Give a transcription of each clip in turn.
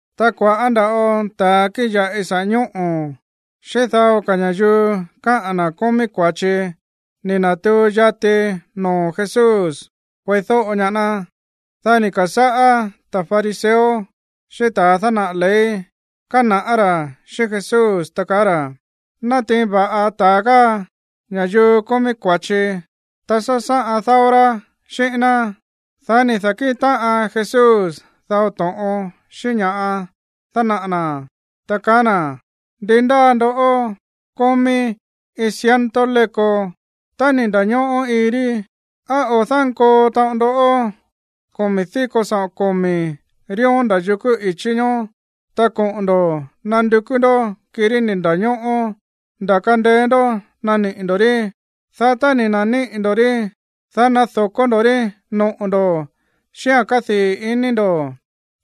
Ta kua̱ꞌá nda̱ꞌo ta̱a kíꞌin ya̱ꞌi saꞌa̱ ñóꞌo̱ xíꞌín dao ka̱ ña̱yuu kaá ra̱ kómí kua̱chi ni̱ na̱tuu yati noo̱ Jesús kueídóꞌo ñaá ná. Dá ni̱ ka̱sáꞌá ta̱ fariseo xíꞌín ta̱ dánaꞌa̱ ley kána̱ꞌá ra̱ xíꞌín Jesús, ta kaá ra̱: ―Nátiin va̱ꞌa ta̱a káa ña̱yuu kómí kua̱chi, ta sásáꞌan dáó rá xíꞌín ná. Dá ni̱ da̱kíꞌin táꞌan Jesús dao to̱ꞌon xíꞌín ña̱ dánaꞌa̱ na̱, ta kaá na̱: ―Ndi ndáa ndoꞌó kómí iin ciento léko, tá ni̱ nda̱ñóꞌó iin rí, ¿á ko̱ dánkoo taꞌon ndó komi̱ díko saꞌo̱n komi̱ ríón nda̱ yukú i̱chí ñoó, ta koꞌo̱n ndo̱ nandukú ndó kirí ni̱ nda̱ñóꞌó nda̱ kandeé ndó naniꞌi̱ ndo̱ rí? Dá tá ni̱ na̱níꞌi̱ ndo̱ rí, dá nado̱kó ndo̱ rí noꞌo̱ ndo̱ xíꞌa̱n kádii̱ ini ndo̱.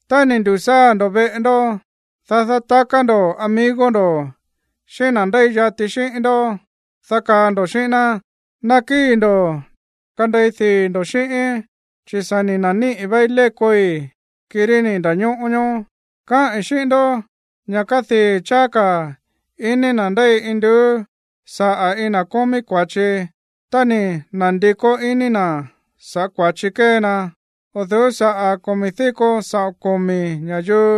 Tá ni̱ ndu̱sáa̱ ndo̱ veꞌe ndó, dá dátaká ndo̱ amigo ndo̱ xíꞌín na̱ ndéi yati xíꞌín ndó, dá kaá ndo̱ xíꞌín ná: “Nakíi̱ ndo̱ kandei dii̱ ndo̱ xíꞌíín, chi̱ sa̱ ni̱ na̱níꞌi̱ váí lékoi̱, kirí ni̱ nda̱ñóꞌó ñoó.” Káꞌi̱n xíꞌín ndó ña̱ kadii̱ cháá ka̱ ini na̱ ndéi induú saꞌa̱ iin na̱ kómí kua̱chi tá ni̱ na̱ndikó iní na̱ sa̱ꞌá kua̱chi kée na, o̱ du̱ú saꞌa̱ komi̱ díko saꞌo̱n komi̱ ña̱yuu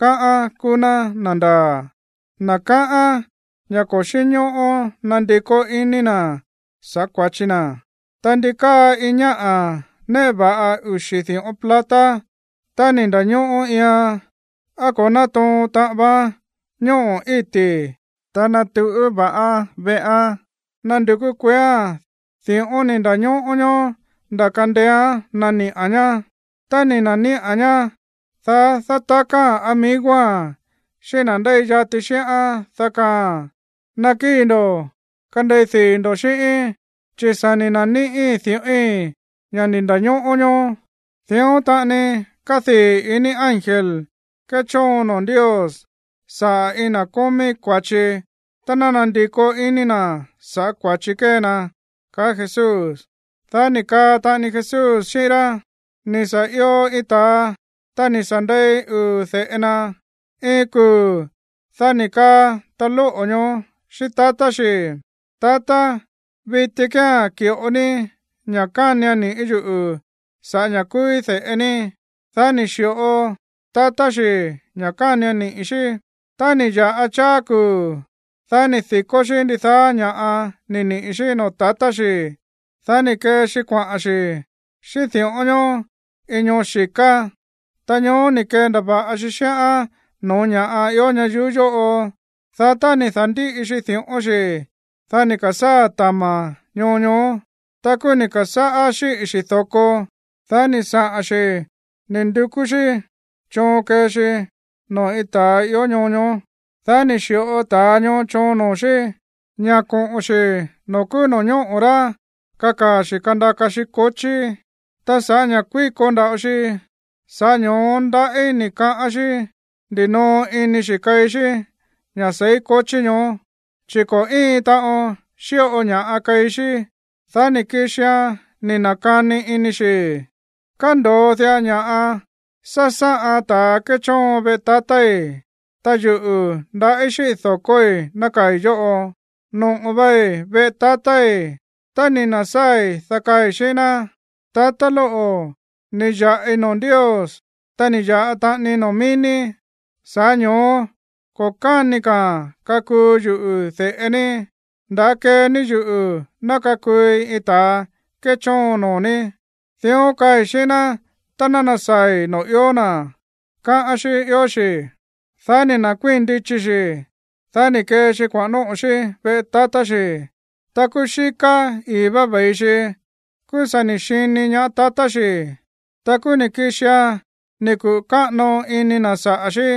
káꞌán kúú ná na̱ ndaa̱, na̱ káꞌán ña̱ ko̱ xínñóꞌó nandikó iní na̱ sa̱ꞌá kua̱chi na̱. ’Ta ndi káa iin ñáꞌa̱ néꞌe va̱ꞌa uxi̱ di̱ꞌón plata, tá ni̱ nda̱ñóꞌó iian, ¿á ko̱ nátoo̱n taꞌan vaán ñóꞌo̱ íti̱, ta nátuꞌú va̱ꞌán veꞌán nándukú kueéa̱n di̱ꞌón ni̱ nda̱ñóꞌó ñoó nda̱ kandeéán naniꞌa̱n ñá? Tá ni̱ na̱níꞌa̱n ñá, dá dátakáa̱n amigoa̱n xíꞌín na̱ ndéi yati xíꞌán, dá kaáa̱n: “Nakíi̱ ndo̱ kandei dii̱ ndo̱ xíꞌíín, chi̱ sa̱ ni̱ na̱níꞌí di̱ꞌói̱n, ña̱ ni̱ nda̱ñóꞌó ñoó.” Dión taꞌani kádii̱ ini ángel kéchoon noo̱ Ndios saꞌa̱ iin na̱ kómí kua̱chi tá nándikó iní na̱ sa̱ꞌá kua̱chi kée na ―kaá Jesús. Dá ni̱ kaa taꞌani Jesús xíꞌín rá: ―Ni̱ sa̱ io iin ta̱a, ta ni̱ sa̱ ndei uu̱ de̱ꞌe na. Iin kuu̱, dá ni̱ kaa ta̱a lóꞌo̱ ñoó xíꞌín tatá xi̱: “Tatá, viti kía̱n ki̱ꞌo ní ña̱ kánian niꞌi̱ yuꞌu̱ sa̱ꞌá ña̱ kúúí de̱ꞌe ní.” Dá ni̱ xi̱ꞌo tatá xi̱ ña̱ kánian niꞌi̱ xí. ’Tá ni̱ ya̱ꞌa cháá kuu̱, dá ni̱ di̱kó xí ndidaá ña̱ꞌa ni̱ niꞌi̱ xí noo̱ tatá xi̱. Dá ni̱ kee xi kuaꞌa̱n xi̱ xíꞌín di̱ꞌón ñoó iin ñoo xi̱ká. Ta ñoó ni̱ kendava̱ꞌa xi xíꞌán no̱ó ña̱ꞌa ió ñayuú yóꞌo. Dá tá ni̱ da̱ndíꞌi xi di̱ꞌón xi̱, dá ni̱ ka̱sáa̱ tama̱ ñoo ñoó. Ta kúú ni̱ ka̱sáꞌá xíꞌi̱ xi̱ do̱ko. Dá ni̱ saꞌa̱n xi̱ ni̱ ndukú xí choon kee xi noo̱ iin ta̱a ió ñoo ñoó. Dá ni̱ xi̱ꞌo ta̱a ñoó choon noo̱ xí ña̱ koꞌo̱n xi̱ noo̱ kúú no̱ñóꞌo̱ rá kakaa̱ xi̱ kandaka xi kochí. Ta sa̱ꞌá ña̱ kuíko nda̱ꞌo xi, sa̱ꞌá ño̱ó ndaꞌí ni̱ kaꞌán xí ndinoo ini xi̱ keí xí ña̱ seí kochí ñoó, chi̱ ko̱ íin taꞌon xíꞌo ña̱ keí xí. ’Dá ni̱ kixian ni̱ na̱kani ini xi̱: “Kándo̱o diꞌa ña̱ꞌa sásáꞌan ta̱a kéchóon veꞌe tatái̱, ta yuꞌu̱, ndaꞌí xíꞌi̱ do̱koi̱ nákaa̱i̱ yóꞌo. Noꞌo̱ vai veꞌe tatái̱. Tá ni̱ na̱sáa̱i̱, dá kaai̱ xíꞌín ná: Tatá lóꞌo̱, ni̱ ya̱ꞌi noo̱ Ndios, ta ni̱ ya̱ꞌa taꞌanii noo̱ mií ní. Sa̱ꞌá ño̱ó ko̱ káni ka̱a̱n kakuu yuꞌu̱ de̱ꞌe ní. Nda̱á kee ní yuꞌu̱ ná kakuui iin ta̱a kéchóon noo̱ ní. Dión kaai̱ xíꞌín ná tá nasaa̱i̱ noo̱ ió na̱”, káꞌán xí ió xi̱. ’Dá ni̱ nda̱kuíi̱n ndichi xi̱, dá ni̱ kee xi kuaꞌa̱n nóꞌo̱ xí veꞌe tatá xi̱. Ta kúú xíká i̱í vá ve̱i xi, kúú sa̱ ni̱ xini ñaá tatá xi̱. Ta kúú ni̱ kixian ni̱ kuꞌu̱ káꞌano ini na̱ saꞌa̱ xí.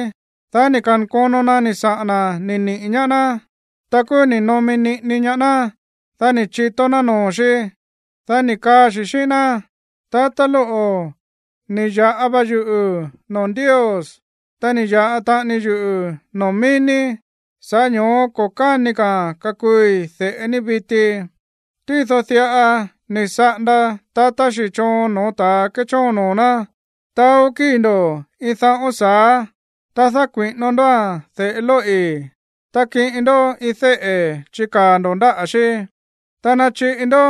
Dá ni̱ ka̱nkono na ni̱ saꞌa̱n na̱ ni̱ niꞌi̱ ñaá ná. Ta kúú ni̱ nomi niꞌini ñaá ná. Dá ni̱ chitó ná noo̱ xí. Dá ni̱ kaa xi̱ xíꞌín ná: “Tatá lóꞌo̱, ni̱ ya̱ꞌa va yuꞌu̱ noo̱ Ndios, ta ni̱ ya̱ꞌa taꞌani yuꞌu̱ noo̱ mií ní. Sa̱ꞌá ño̱ó ko̱ káni ka̱a̱n kakuui de̱ꞌe ní viti.” ’Tído diꞌa ni̱ saꞌanda tatá xi̱ choon no̱ó ta̱ kéchóon noo̱ ná: “Taó kíi̱ ndo̱ iin daꞌón sa̱á, ta dákui̱ꞌino ndóa̱n de̱ꞌe lóꞌi̱. Ta kiꞌin ndó iin déꞌe̱ chikaa̱ ndo̱ ndáꞌa̱ xí, ta nachiꞌi ndó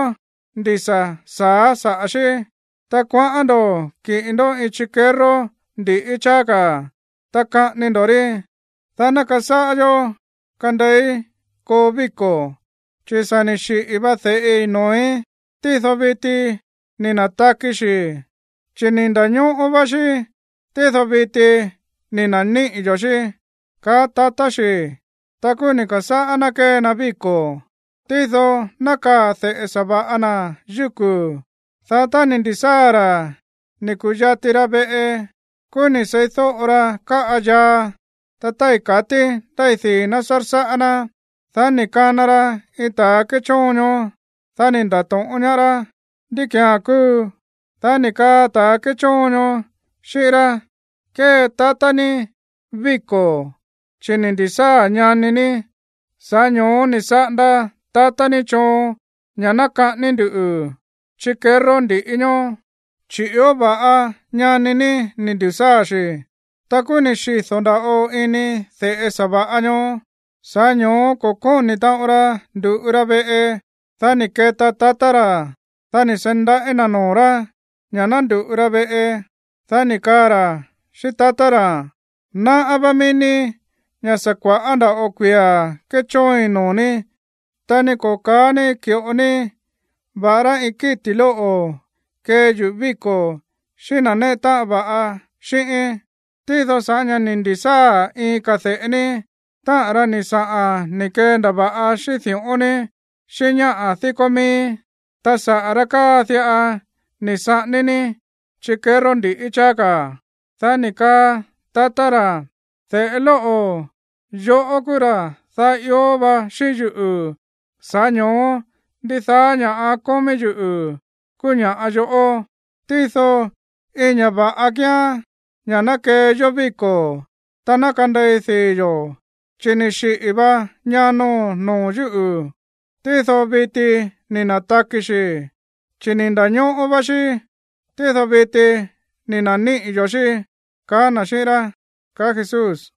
ndisa̱ sa̱á saꞌa̱ xí. Ta kuaꞌán ndo̱ kiꞌin ndó iin chikerró ndi̱ꞌí cháá ka̱, ta kaꞌání ndo̱ rí. Dá ná kasáꞌan yó kandeií koo víko̱. Chi̱ ni̱ sa̱ xiꞌi̱ va de̱ꞌi noo̱í, tído viti ni̱ na̱taki xi̱, chi̱ ni̱ nda̱ñóꞌó vá xí, tído viti ni̱ na̱níꞌi̱ yo̱ xí”, kaá tatá xi̱. ’Ta kúú ni̱ ka̱sáꞌá ná kée na víko̱. ’Tído nákaa̱ de̱ꞌe sa̱va̱ꞌa na̱ yúku̱. Dá tá ni̱ ndi̱sáa̱ ra̱ ni̱ ku̱yati ra veꞌe, kúú ni̱ seídóꞌo ra káꞌa yaa, ta tái̱ katí ndéi dii̱ ná sársáꞌá ná. Dá ni̱ kana ra iin ta̱ kéchóon ñoó. Dá ni̱ nda̱to̱ꞌón ñaá rá: “¿Ndí ki̱án kúu?” Dá ni̱ kaa ta̱ kéchóon ñoó xíꞌín rá: “Kée tatá ní víko̱, chi̱ ni̱ ndi̱sáa̱ ñani ní. Sa̱ꞌá ño̱ó ni̱ saꞌanda tatá ní choon ña̱ ná kaꞌání nduꞌu̱ chikerró ndi̱ꞌí ñoó, chi̱ ió va̱ꞌa ñani ní ni̱ ndu̱sáa̱ xi̱.” ’Ta kúú ni̱ xido̱ nda̱ꞌo ini de̱ꞌe sa̱va̱ꞌa ñoó. Sa̱ꞌá ño̱ó ko̱ kóni̱ taꞌon ra ndu̱ꞌu ra veꞌe. Dá ni̱ keta tatá ra̱. Dá ni̱ seí ndaꞌí na̱ noo̱ rá ña̱ ná ndu̱ꞌu ra veꞌe. Dá ni̱ kaa ra̱ xíꞌín tatá ra̱: “Náꞌá vá mií ní ña̱ sa̱ kua̱ꞌá nda̱ꞌo kuia̱ kéchóoin noo̱ ní, ta ni ko̱ ka̱á ní ki̱ꞌo ní va̱ꞌará iin kíti̱ lóꞌo̱ kee yuꞌu̱ víko̱ xíꞌín na̱ néꞌe táꞌan va̱ꞌa xíꞌíín. Tído sa̱ꞌá ña̱ ni̱ ndi̱sáa̱ iin ka̱ de̱ꞌe ní, táꞌa̱n ra̱ ni̱ saꞌa̱n ni̱ kendava̱ꞌa xíꞌín di̱ꞌón ní xíꞌín ñáꞌa̱ díkó mií, ta sa̱ꞌá ra̱ káa diꞌa ni̱ saꞌání ní chikerró ndi̱ꞌí cháá ka̱.” ’Dá ni̱ kaa tatá ra̱: “De̱ꞌe lóꞌo̱, yoꞌó kúú ra̱ daá ió va xíꞌín yuꞌu̱. Sa̱ꞌá ño̱ó ndidaá ña̱ꞌa kómí yuꞌu̱ kúú ña̱ꞌa yoꞌó. Tído iin ña̱ va̱ꞌa kíán ña̱ ná kee yó víko̱, ta ná kandei dii̱ yo̱, chi̱ ni̱ xiꞌi̱ va ñano̱n noo̱ yúꞌu̱, tído viti ni̱ na̱taki xi̱, chi̱ ni̱ nda̱ñóꞌó vá xí, tído viti ni̱ na̱níꞌi̱ yo̱ xí”, kaá na̱ xíꞌín rá ―kaá Jesús